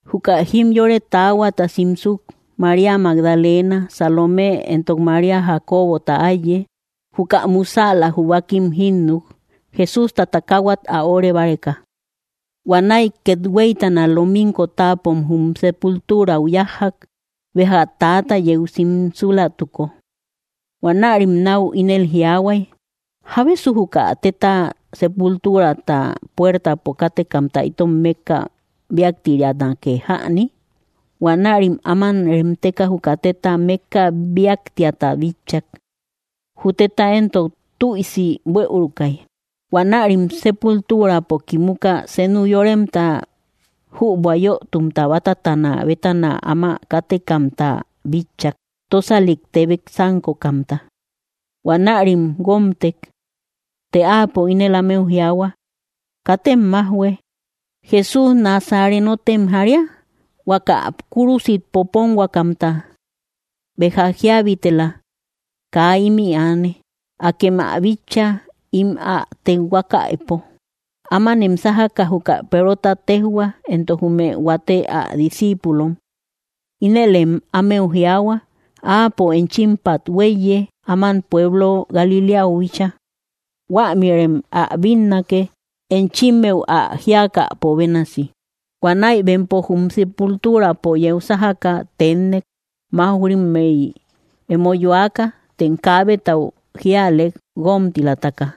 Juka jimyore taahuata simsuk, María Magdalena, Salomé, éntok María Jacobota áiye, juka musäla jubakim jínnuk Jesústa takahuat ä óre báreka. Huanäi kethuéitana, lominko táapom jum sépulturau yájjak, béja täata yeu simsúlatuko. Huanärim nau ínel jiaahuay: —¿Jábesu juka téta sépultuurata puértapo kátekamta itom mékka bíaktirianake jäni? Huanärim áman remteka juka tétata mékka bíaktiata bitchak; jü teta éntok tüisi buëuruakai. Huanärim sépulturapo kimuka, senu yoremta jübua yötumta batatana bétana áma kátekamta bitchak, tósalik tebek sánkokamta; huanärim guómtek. Të áapo ínel ámeu juahua: —Katem majhuë. Jesús Nasarénotem jaría, huaka kúrusit popónhuakamta. Béja jíabitela; kaa imï aane. Akem ä bitcha im ä tekhuákaïpo. Ámanem sájakä juka Perota téjhua, éntok jume huate ä discíipulom. Ínelem ámeu jiaahua: “Áapo enchímpat huéiye áman pueblo Galiléau bíchaa; huämïrem ä bínnake, enchimeu ä jíakäpo bénasi.” Huanäi bempo jum sépultuurapo yeu sájakä teénnek, mauj‑rimmei emo yoáka. Tem kaabetau jíalek, guómtilataka.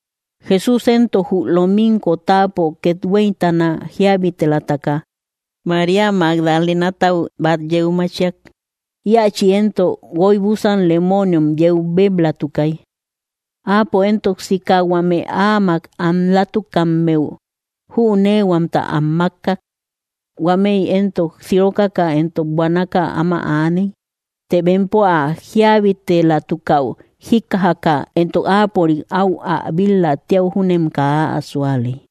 Jesús éntok jü lominko táapo kethuéitana jíabitelataka, María Magdalénatau bat yeu machiak, iachï éntok guoibusan lemoniom yeu béblatukai. Áapo éntok sika huame áamak anlatukammeu jünéehuamta am makkak; huámëi éntok sirókakä éntok buanaka áma aaney. Të bempo ä jíabitelatukäu jíkkajakä, éntok áapörik au ä bil‑la tíau júnem kaa ä súalei.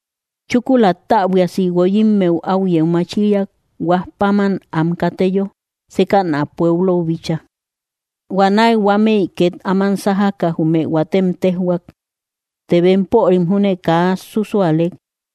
Chúkula, täbuiasi guoyímmeu au yeu machíriak, huaj páman am kateyo, sékäna pueblou bíchaa. Huanäi huámëi ket áman sájaka jume huaatem tejhuak; të bempörim júne kaa súsualek.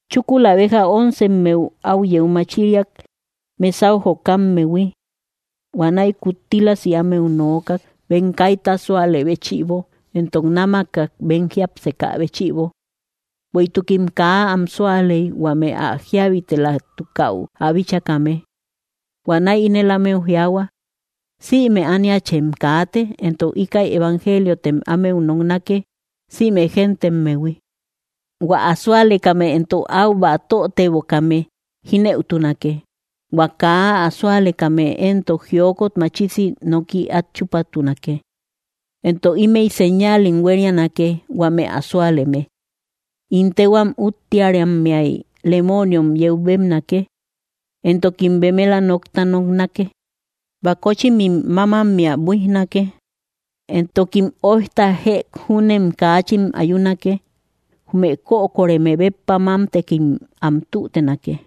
Chúkula béja óncemmeu, au yeu machíriak mesáu jokammehui. Huanäi kuttílasi ámeu nokak bem kaíta súalë béchïbo, éntok námakak bem jiápsekä béchïbo. Bueïtukim kaa am súaley huame ä jíabitelatukäu ä bíchakame. Huanäi ínel ámeu jiaahua: —Sïme ániachem kaate, éntok íkäi evangeliotem ámeu noknake sïme géntemmehui. Huä ä súalekame éntok au batötebokame jínëutunake. Huä kaa ä súalekame éntok jiokot machisi noki at chúpatunake. Éntok ímëi séñalim huérianake huame ä súaleme: In téhua úttearammeay lemoniom yeu bébnake; éntokim bemela nokta noknake; bakóchimim mámammea buijnake; éntokim óijta jëk júnem kachin ayunake; jume kökoreme béppa mámtekim am tütenake.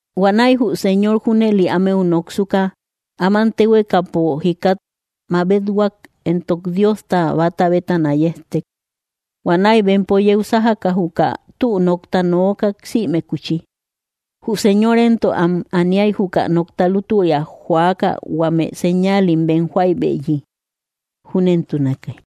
Huanäi jü Señor junëli ámeu noksuka, áman téhuekapo jikat mabethuak, éntok Diosta bata bétana yéjtek. Huanäi bempo yeu sájaka, juka tü nokta nookak sïmekuchi. Jü Señor éntok am aníai juka nokta lútüria jóakä huame señáalim bem joaïbeyi. Júnentunake.